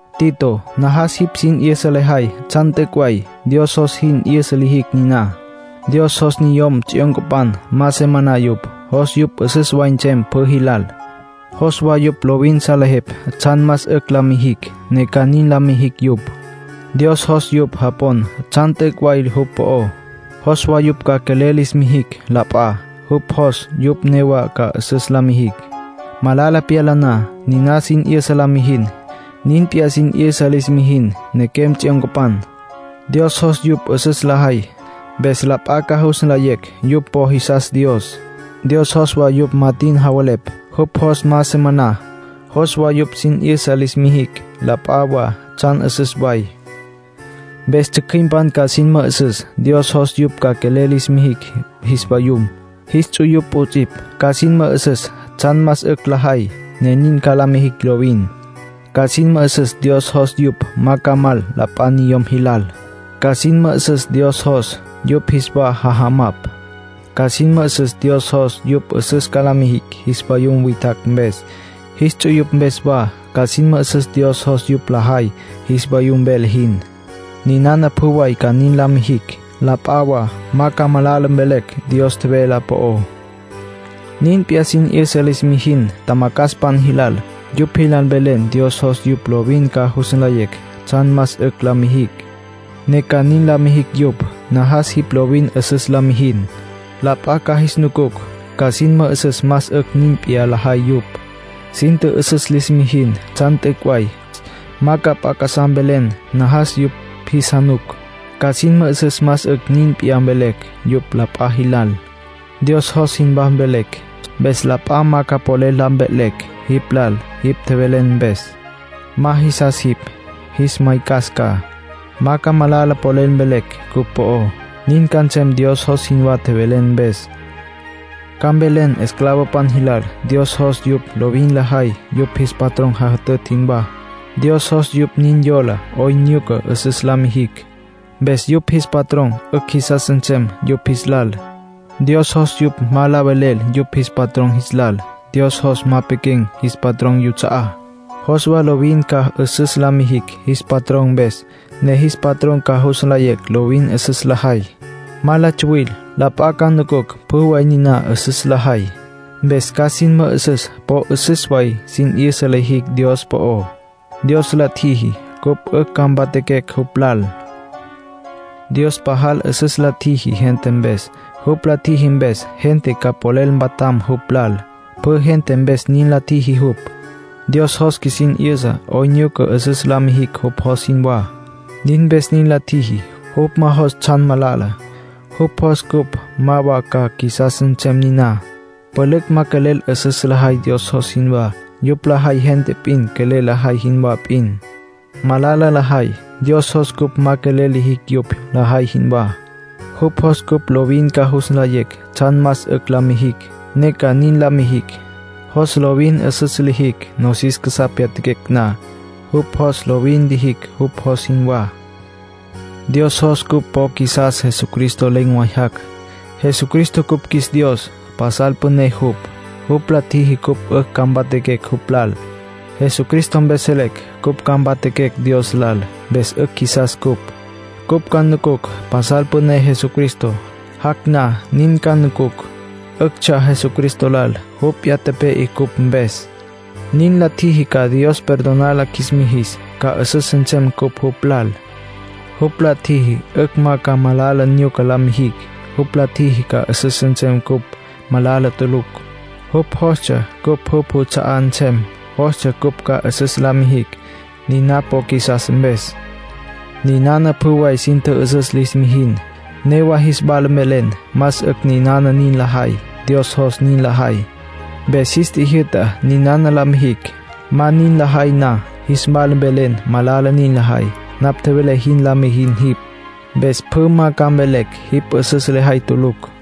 Tito, najas jipj sin 'yüsa lejay tsjan t'üc' way; Dios jos sin 'yüsa lijicj niná. Dios jos niyom tsjyoncapan ma se maná yupj. Jos yupj 'üsüs way nsem pjü jilal. Jos wa yupj lovin salejepj tsjan más 'ücj la mijicj, ne ca nin la mijicj yupj. Dios jos yupj japon tsjan t'üc' way jupj po'ó. Jos wa yupj ca quelel lis mijicj la p'a. Jupj jos yupj newa ca 'üsüs la mijicj, malala pyala na. Niná sin 'yüsa la mijin. Nin p'iyá, sin 'yüsa lis mijin nequem tsjyoncapan. Dios jos yupj 'üsüs lajay, mpes la p'a ca jus nlayecj yupj po jisas Dios. Dios jos wa yupj ma tin javelepj. Jupj jos ma se maná. Jos wa yupj sin 'yüsa lis mijicj la p'a wa tsjan 'üsüs way. Mpes tsjücjüimpan ca sin mü'üsüs Dios jos yupj ca quelel lis mijicj jis vayum, jis ts'uyupj 'ots'ipj. Ca sin mü'üsüs tsjan más 'ücj lajay, ne ca nin la mijicj lovin. Ca sin mü'üsüs Dios jos yupj ma ca mal la p'a niyom jilal. Ca sin mü'üsüs Dios jos yupj jis wa jajamapj. Ca sin mü'üsüs Dios jos yupj 'üsüs ca la mijicj jis vayum witjacj mpes, jis ts'uyupj mpes wa. Ca sin mü'üsüs Dios jos yupj lajay jis vayum vele jin. Ninana pjü way ca nin la mijicj, la p'a wa ma ca malala mvelecj Dios tjevelá po'ó. Nin p'iyá, sin 'yüsa lis mijin tjamacjaspan jilal. Yupj jilal mvelen Dios jos yupj lovin ca jus nlayecj tsjan más 'ücj la mijicj, ne ca nin la mijicj yupj. Najas jipj lovin 'üsüs la mijin; la p'a ca jis nucucj, ca sin mü'üsüs más 'ücj nin p'iyá lajay yupj. Sin tjü'üsüs lis mijin tsjan t'üc' way. Ma ca p'a casá mvelen; najas yupj jis januc, ca sin mü'üsüs más 'ücj nin p'iyá mvelecj yupj la p'a jilal. Dios jos jinwá mvelen. Mpes la p'a ma ca polel la mve'lecj jipj lal jipj tjevelen mpes. Ma jisas jipj, jis maycas ca. Ma ca malala polel mvelecj cupj po'ó; nin ca nsem Dios jos jinwá tjevelen mpes. Ca mvelen esclavopan jilal Dios jos yupj lovin lajay yupj jis patrón jajütütj jinwá. Dios jos yupj nin yola 'oyn nyuca 'üsüs la mijicj, mpes yupj jis patrón 'ücj jisas nsem yupj jis lal. Dios jos yupj ma la velel yupj jis patrón jis lal. Dios jos ma pequen̈ jis patrón yuts'a'á. Jos wa lovin ca 'üsüs la mijicj jis patrón mpes, ne jis patrón ca jus nlayecj lovin 'üsüs lajay; ma la tsuwil. La p'a ca nucucj pjü way niná 'üsüs lajay, mpes ca sin mü'üsüs po 'üsüs way sin 'yüsa lijicj Dios po'ó. Dios la tjiji cupj 'ücj ca mpatjaquecj jupj lal. Dios pajal 'üsüs la tjiji gente mpes. Jupj la tjiji mpes, gente ca polel mpatjam jupj lal. Pjü gente mpes nin la tjiji jupj. Dios jos qjuisin 'yüsa 'oyn nyuca 'üsüs la mijicj jupj jos jinwá; nin mpes nin la tjiji. Jupj ma jos tsjan malala, jupj jos cupj ma wa ca qjuisas nsem niná. Pülücj ma quelel 'üsüs lajay Dios jos jinwá. Yupj lajay gente p'in quelel lajay jinwá p'in. Malala lajay. Dios jos cupj ma quelel lijicj yupj lajay jinwá. Jupj jos cupj lovin ca jus nlayecj tsjan más 'ücj la mijicj, ne ca nin la mijicj. Jos lovin 'üsüs lijicj, nosis casá pyatjaquecj na. Jupj jos lovin lijicj jupj jos jinwá. Dios jos cupj po qjuisas Jesucristo len̈ way jac'. Jesucristo cupj qjuis Dios, pasal püné jupj. Jupj la tjiji cupj 'ücj ca mpatjaquecj jupj lal. Jesucristo mpes selecj cupj ca mpatjaquecj Dios lal. Mpes 'ücj qjuisas ncupj. Cupj ca nucucj pasal püné Jesucristo; jac' na nin ca nucucj. 'Üctsja Jesucristo lal jupj p'iyá tepe'e cupj mpes. Nin la tjiji ca Dios perdonar la qjuis mijis, ca 'üsüs nsem cupj jupj lal. Jupj la tjiji 'ücj ma ca malala nyuca la mijicj. Jupj la tjiji ca 'üsüs nsem cupj, malala tulucj. Jupj jostsja cupj jupj juts'a'á nsem. Jostsja cupj ca 'üsüs la mijicj, niná po qjuisas mpes. Ninana pjü way sin tjü'üsüs lis mijin. Newa jis wala mvelen más 'ücj ninana nin lajay. Dios jos nin lajay. Mpes jis tjijyü'ta ninana la mijicj. Ma nin lajay na, jis wala mvelen malala nin lajay. Napj tjevelé jin la mijin jipj. Mpes pjü ma ca mvelecj jipj 'üsüs lejay tulucj.